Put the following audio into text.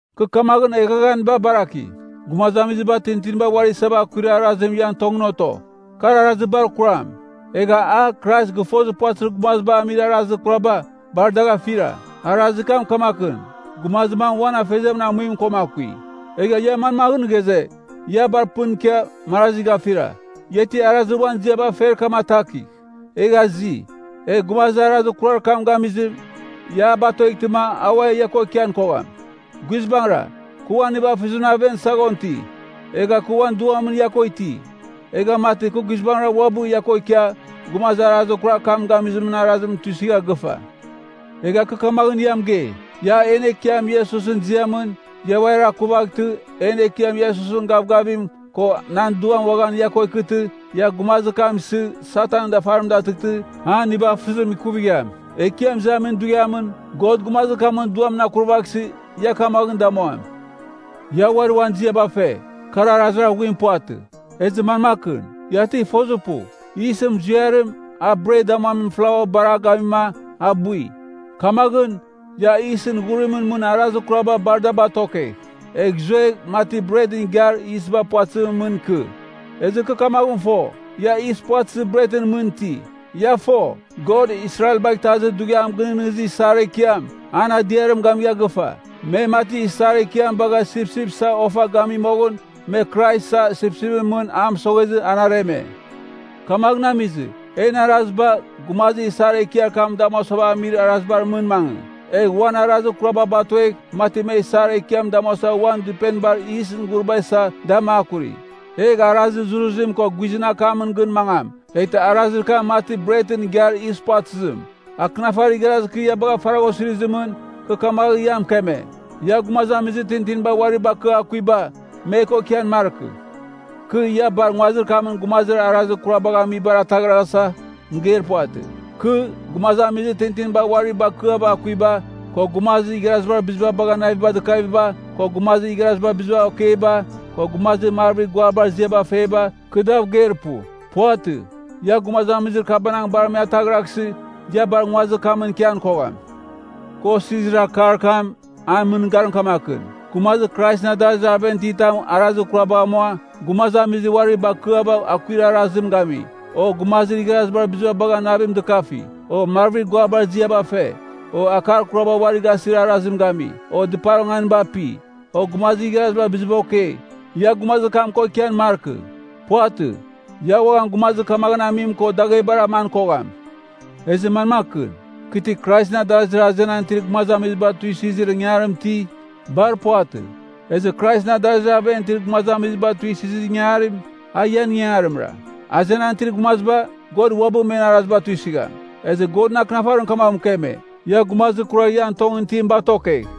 Kɨ kamaghɨn eghaghaniba baraki, gumazamiziba tintinibar uari isava akuir arazim ian tongɨn oto. Kar arazir bar kuram. Egha a, Krais gɨfozir puvatɨzir gumaziba amir arazir kuraba, bar dagh afira. Arazir kam kamakɨn, gumazir mam uan afeziamɨn amuim koma akui. Egha ia manmaghɨn ghaze, ia bar pɨn ikia, marazi gafira? Ia ti arazir uan ziaba fer kam atakigh, egh azi. Egh gumazir arazir kurar kam gamizim, ia a batueghtɨma, a ua ia ko ikian kogham. Guizbangɨra, kɨ uan nivafɨzimɨn ian saghon iti, egha kɨ uan duam ia ko iti. Egha mati, kɨ guizbangɨra uabɨ ia ko ikia, gumazir arazir kurar kam gamizimɨn arazim tuisɨgha gɨfa. Egha kɨ kamaghɨn mɨgei, ia en Ekiam Iesusɨn ziamɨn, ia uari akuvaghtɨ, en Ekiam Iesusɨn gavgavim, ko nan duam uaghan, ia ko ikɨtɨ, ia gumazir kam isɨ, Satanɨn dafarim datɨghtɨ, an nivafɨzim ikuvigham. Ekiam Izamin Dughiamɨn, God gumazir kamɨn duamɨn akurvaghsɨ, ia kamaghɨn damuam. Ia uari uan ziaba fe, kar arazir aghuim puvatɨ. Ezɨ manmakɨn? Ia ti fozir pu, yisɨn muziarim, a bret damuamin flaua bar a gamima, a bui? Kamaghɨn, ia yisɨn ghurimɨn mɨn arazir kuraba bar da batokegh, egh zuegh, mati bretɨn igiar yisba puvatɨzimɨn mɨn ikɨ. Ezɨ kɨ kamaghɨn fo, ia yis puvatɨzir bretɨn mɨn iti. Ia fo, God Israelbagh Itazir Dughiam Gɨnɨghnɨzir Isar Ekiam, an adiarim gamigha gɨfa. Me, mati Isar Ekiam bagha sipsip isa ofa gami moghɨn, me Krais isa sipsipɨn mɨn a mɨsoghezɨ, an areme. Kamaghɨn amizɨ, en araziba, gumazir Isar Ekiar kam damuasava amir arazibar mɨn mangɨ. Egh uan arazir kuraba batuegh, mati me Isar Ekiam damuasa uan dɨpenibar yisɨn ghuriba isa, da makuri. Egh arazir zuruzim ko guizɨn akamɨn gɨn mangam, eghtɨ arazir kam mati bretɨn igiar yis puvatɨzim. Akɨnafarir igharazir kɨ ia bagha faragha osirizimɨn, kɨ kamaghɨn ia mɨkeme, “Ia gumazamizir tintiniba uari bakɨa akuiba, me ko ikian markɨ.” Kɨ, ia bar nguazir kamɨn gumazir arazir kurar kabagh amibar ataghraghasa, mɨgeir puvatɨ. Kɨ, gumazamizir tintinibar uari bakɨava akuiba, ko gumazir igharazibar biziba bagha naviba dɨkaviba, ko gumazir igharazibar biziba okeiba, ko gumazir marvir guabar ziaba feba, kɨ dav geir pu. Puvatɨ. Ia gumazamizir kabanang bar me ataghraghsɨ, ia bar nguazir kamɨn ikian kogham. Kɨ osirizir akar kam, an mɨngarim kamakɨn: Gumazir Kraisɨn adarazir aven iti tam arazir kurabagh amua, gumazamizir uari bakɨava akuir arazim gami, o gumazir igharazibar biziba bagha navim dɨkafi, o marvir guabar ziaba fe, o akar kuraba uari gasir arazim gami, o dɨpar onganiba api, o gumazir igharazibar biziba okei, ia gumazir kam ko ikian markɨ. Puvatɨ. Ia uaghan gumazir kamaghɨn amim ko daghebar aman kogham. Ezɨ manmakɨn? Kɨ ti Kraisɨn adarazir azenan itir gumazamiziba tuisɨzir ingangarim iti? Bar puvatɨ. Ezɨ Kraisɨn adarazir aven itir gumazamiziba tuisɨzir ingangarim, a ian ingangarimra. Azenan itir gumaziba, God uabɨ men araziba tuisɨgham. Ezɨ Godɨn Akɨnafarim kamaghɨn mɨkeme, “Ia gumazir kurar ian tongɨn itim batokegh.”